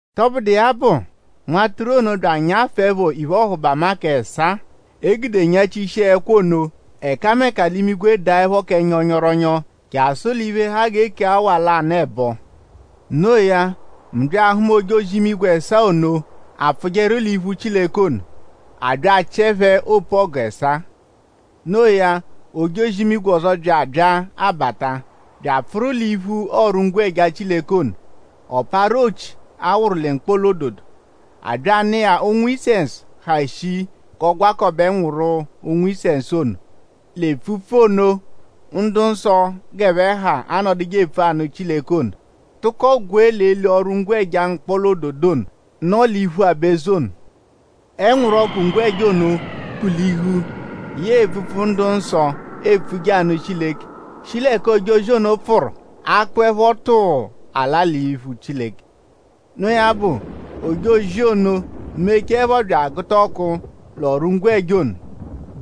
Tọbudu iya bụ; Nwatụru ono bya anyafụepho iphe-ọhubama k'ẹsaa, e gude nyachishia ẹkwo ono; ẹkameka l'imigwe daẹpho kẹ nyọnyoronyo jasụ l'iphe, ha g'e kee awa lanụ ẹbo. No iya; mu bya ahụma ojozi-imigwe ẹsaa ono, apfụjeru l'iphu Chileke ono. A bya achịe phẹ opu-ọgu ẹsaa. No iya; ojozi-imigwe ọzo bya bya abata bya apfụru l'iphu ọru-ngwẹja Chileke ono. Ọ parụ ochi, a wụru lẹ mkpọla-ododo. A bya anụ iya ụ̀nwù-isẹnsu, ha shii g'ọ gwakọbe ẹnwuru ụ̀nwù-isẹnsu ono l'epfupfu ono, ndu-nsọ g'ẹphe ha anọduje epfu anụ Chileke ono; tụko gwee l'eli ọru-ngwẹja mkpọla-ododo ono, nọ l'iphu aba-eze ono. Ẹnwuru ọku ngwẹja ono kpụ-lihu yẹe epfupfu, ndu-nsọ epfuje anụ Chileke; shi l'ẹka ojozi ono pfụru akpụepho tụuu ala l'iphu Chileke. Noo ya bụ: ojozi ono mechaẹpho bya agụta ọku l'ọru-ngwẹja ono;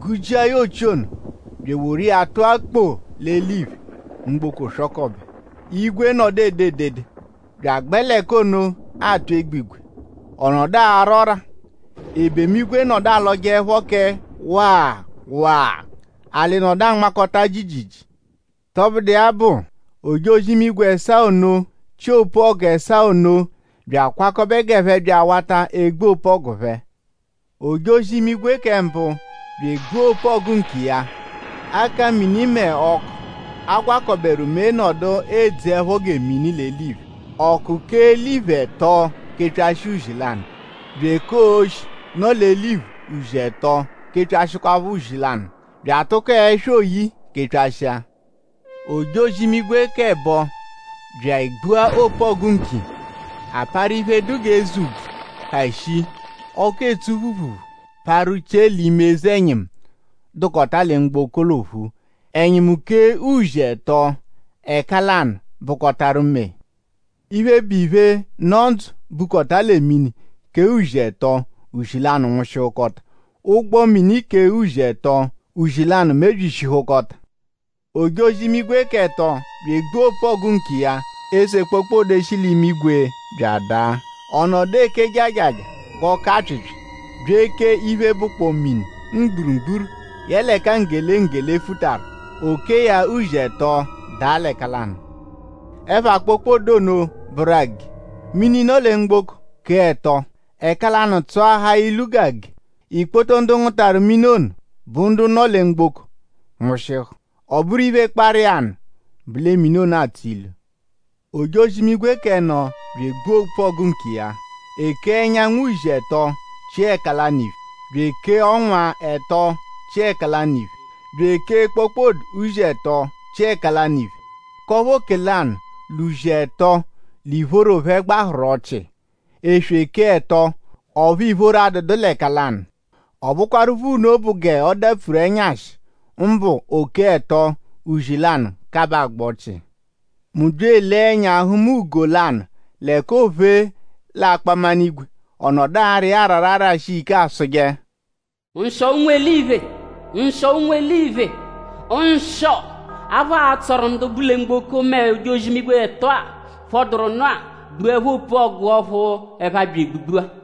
gụ-jia ochi ono; bya eworu iya tụa kpoo l'eliphe. Mgboko swọkobe. Igwe nọdu ede edede bya agbẹ l'ẹka ono atụ egbigwe; ọ nọdu ara ọ́rà; ebemu-igwe nọdu alọjeepho kẹ waa waa; alị nọdu anmakọta jiijiijii. Tọbudu iya bụ; ojozi-imigwe ẹsaa ono, chị opu-ọgu ẹsaa ono bya akwakọbe g'ẹphe bya awata egbu opu-ọgu phẹ. Ojozi-imigwe kẹ mbụ bya egbua opu-ọgu nkiya. Akamini mẹ ọku, a gwakọberu mee nọdu edzeẹpho gẹ mini l'eliphe. Ọku kèé eliphe ẹto kepyashịa uzi lanụ; bya èkèé oshi, nọ l'eliphe uzi ẹto kepyashịkwapho uzi lanụ; bya atụko ẹswa oyi kepyashịa. Ojozi-imigwe k'ẹbo bya egbua opu-ọgu nkiya. A parụ iphe, dụ g'eze úbvú, ha shii, ọku etsu phuruphuru parụ chie l'ime eze-ẹnyimu, dụkota lẹ mgboko l'ophu. Ẹnyimu kèé uzi ẹto; ẹka lanụ bụkotaru mee. Iphe, bụ iphe, nọ ndzụ, bukọta lẹ mini kèé uzi ẹto; uzi lanụ nwụshihukota. Ụgbo mini kèé uzi ẹto; uzi lanụ mebyishihukọta. Ojozi-imigwe k'ẹto bya egbua opu-ọgu nkiya; eze kpokpode shi l'imigwe bya adaa. Ọ nọdu eke jaajaajaa g'ọku-apyịpyi bya èkèé iphe, bụkpoo mini mgburugburu yẹle ẹka nggele nggele futaru; o kèé ya uzi ẹto daa l'ẹka lanụ. Ẹpha kpokpode ono bụru “Age.” Mini, nọ lẹ mgboko kèé ẹto; ẹka lanụ tsọahaa ilu g'age. Ikpoto ndu ngụtaru mini ono, bụ ndu nọ lẹ mgboko nwụshihu; ọ bụru iphe, kparụ iya nụ bụ lẹ mini ono atsọ ilu. Ojozi-imigwe k'ẹno bya egbua opu-ọgu nkiya. E kèé ẹnyanwu uzi ẹto chia ẹka lanụ iphe; bya èkèé ọnwa ẹto chia ẹka lanụ iphe; bya èkèé kpokpode uzi ẹto chia ẹka lanụ iphe; k'ọphu oke lanụ l'uzi ẹto l'ìphóró phẹ gbaaharu ọchii. Eswe kèé ẹto; ọphu ìphóró adụdu l'ẹka lanụ. Ọ bụkwarupho nno bụ g'ọ dapfuru ẹnyashi; mbụ o kèé ẹto; uzi lanụ kabaa agba ọchii. Mu bya elee ẹnya hụma ugo lanụ l'ẹka oophe l'akpaminigwe. Ọ nọdu ara iya arara arashi iya ike asụje: “Nshịo ụnwu-eliphe; nshịo ụnwu-eliphe; nshịo! Aphụ atsọru ndu bu lẹ mgboko mẹ ojozi-imigwe ẹto-a, phọduru nụ-a gbuẹpho opu-ọgu ọphu ẹphe abya egbugbu-a.”